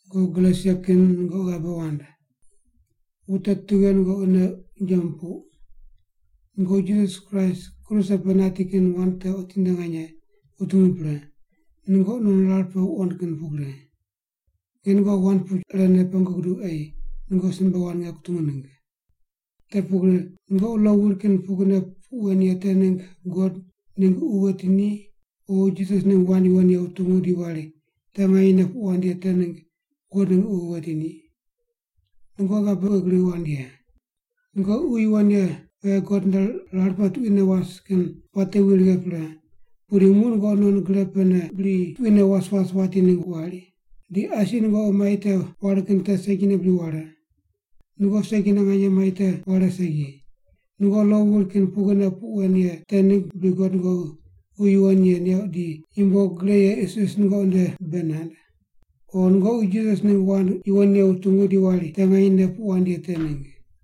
Nungoqi Galesia kin nungoqi ghabe wand. Wute tughe nungoqi nei unje mupuq? Nungoqi Jisas Kraist kruse pe nati kin wand te otinde nganye wutungu pre, nungoqi non rar pe wuqond kin pugri. Nge nungoqi wand puch irene pengu guduq ei nungoqi simbe wand nge kutungu ningg. Te pugri nungoqi lo wuri kin pugrine puq wen ye te ningg God ningg Ququ weti ni, o Jisas ningg wand yuwon ye wutungu di wari te nganyene puq wand ye te ningg God ningg Ququ weti ni? Nungoqi ghabe pughe gri wand ye? Nungoqi Ququ Yuwon Ye pe God nde rar pe tuquine was kin puate wi righe pre, pudi muq nungoqi non gre pene bri tuquine was was wati ningg wari? Di asi nungoqi mai te ware kin te segine bri ware? Nungoqi segine nganye mai te ware segi. Nungoqi lo wuri kin pugrine puq wen ye te ningg bri God nungoqi Ququ Yuwon Ye neuq di yumbo gre ye isis nungoqi nde bei nand? O nungoqi Jisas ningg wand yuwon ye wutungu di wari te nganyene puq wand ye te ningg?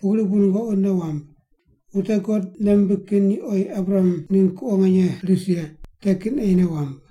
Pugri bu nungoqi nei wamb. Wute God nei rimbig kin ni oyi Abraham ningg kuqo nganye ris ye, te kin ei nei wamb.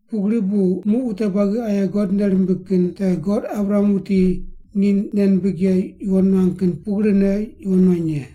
Pugri bu muq wute buagi aye God nei rimbig kin te God Abraham wuti ni nei nimbig ye yuwon nuang kin pugrine yuwon nuany ye.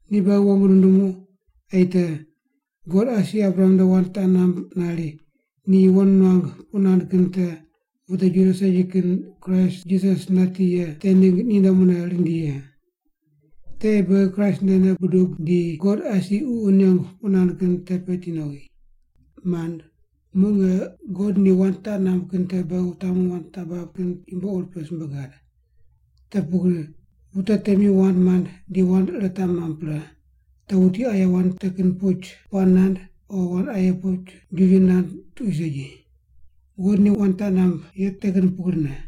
Ni beghi wong nundumu ei te God asi Abraham nde wand taq namb nari ni yuwon nuang puq nand kin te wute Juda segi kin Kraist Jisas nati ye te ningg ninde mune rindi ye. Te ei beghi Kraist nde nei budub di God asi Ququ nengu puq nand kin te peti nowi. Mand, muq nge God ni wand taq namb kin te beghi wutamu wand taq bab kin yumbo ur pe simbe gad. Te pugri wute temi wand mand di wand ire taq mamb pre, te wuti aye wand te kin puch puaq nand o wand aye puch jiju nand tuqui segi. God ni wand taq namb ye te kin pugrine.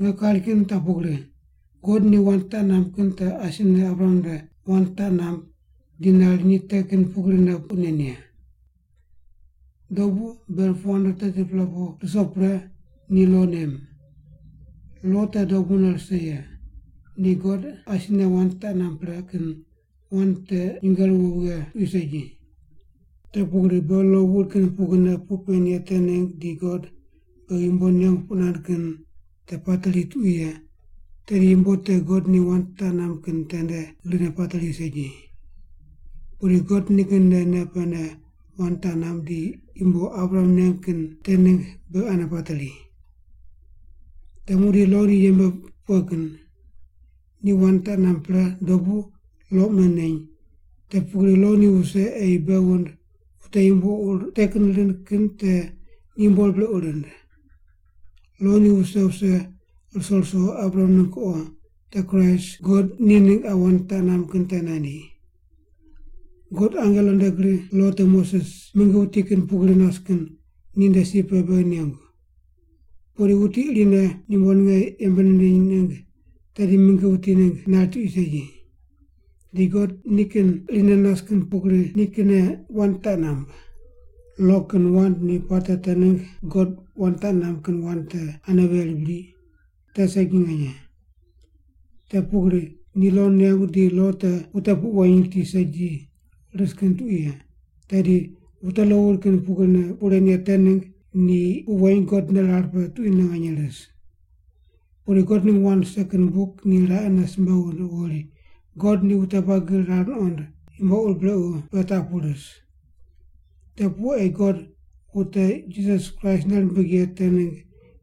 Nge kari kin taq pugri, God ni wand taq namb kin te asine Abraham nde wand taq namb di nari ni te kin pugrine puq nen ye. Dobu ber 430-pela pu ruso pre ni lo nem. Lo te dobune rise ye, ni God asine wand taq namb pre kin wand te nyinge ruwo vighe tuqui segi. Te pugri beghi lo wuri kin pugrine puq pen ye te ningg di God beghi yumbo nengu puq nand kin te pateri tuqui ye, tedi yumbo te God ni wand taq namb kin tende grine pateri segi. Pudi God nikin nde nei pene wand taq namb di yumbo Abraham neng kin te ningg beghi ane pateri. Te muqdi lo ni yembe pughe kin? Ni wand taq namb pre dobu lo mune neny, te pugri lo ni wuse ei bei wund wute yumbo ur te kin rind kin te ni yumbo ur brequ rind. Lo ni wuse wuse ruso ruso Abraham ningg kuqo, te Kraist, God ni ningg qa wand taq namb kin te nandi. God angelo nde gri lo te Moses, mingi wuti kin pugri nas kin, ninde si pe beghi nengu. Pudi wuti irine yumbo ninge yembe nindiny ningg tedi mingi wuti ningg nari tuqui segi. Di God nikin irine nas kin pugri nikinne wand taq namb. Lo kin wand ni puate te ningg God wand taq namb kin wand te ane veri bri? Te segi nganye. Te pugri ni lo nengu di lo te wute puq weny riti segi ris kin tuqui ye, tedi wute lo wuri kin pugrine puq ren ye te ningg ni puq weny God nde rar pe tuquine nganye ris. Pudi God ningg wand rise kin buk ni raqene simbe wund wuri God ni wute buagi rar nuqond yumbo ur brequ pe taq pu ris. Te pu ei God wute Jisas Kraist nei rimbig ye te ningg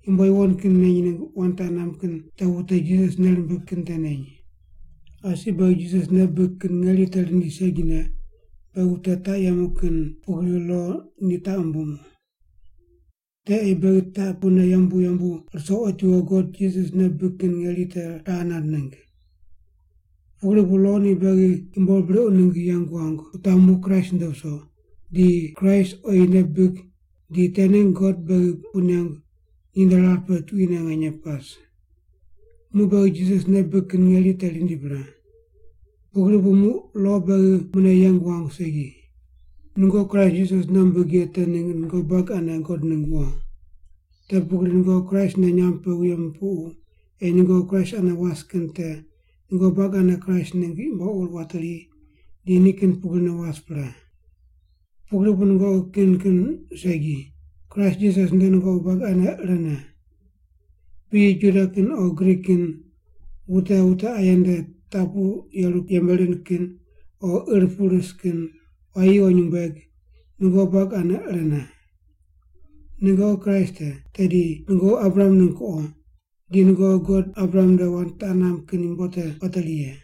yumbo yuwon kin neny ningg wand taq namb kin te wute Jisas nei rimbig kin te neny. Asi beghi Jisas nei bibig kin ngeri te rindi segine, beghi wute taq yemu kin pugri lo ni taq wumbumu. Te ei beghi taq pune yembu yembu ruso otiwo God Jisas nei bibig kin ngeri te raqe nand ningg. Pugri bu lo ni beghi yumbo ur brequ ningg yeng wuangu wutamu Kraist nde wuso, di Kraist oyi nei bibig di te ningg God beghi puq nengu ninde rar pe tuquine nganye pas. Muq beghi Jisas nei bibig kin ngeri te rindi pre. Pugri bu muq lo beghi mune yeng wuangu segi. Nungoqi Kraist Jisas nei wumbig ye te ningg nungoqi buagi ane God ningg wo. Te pugri nungoqi Kraist nde nyamb pe wuye mupuqu ei nungoqi Kraist ane was kin te nungoqi buagi ane Kraist ningg yumbo ur wateri di ni kin pugri was pre. Pugri bu nungoqi kin kin segi, Kraist Jisas nde nungoqi buagi ane irene. Piyi Juda kin o Grik kin, wute wute aye nde taq pu yeru yembe rind kin o ir pu ris kin, quayi o nyumbueg, nungoqi buagi ane irene. Nungoqi Kraist te, tedi nungoqi Abraham ningg kuqo, di nungoqi God Abraham nde wand taq namb kin yumbo te wateri ye.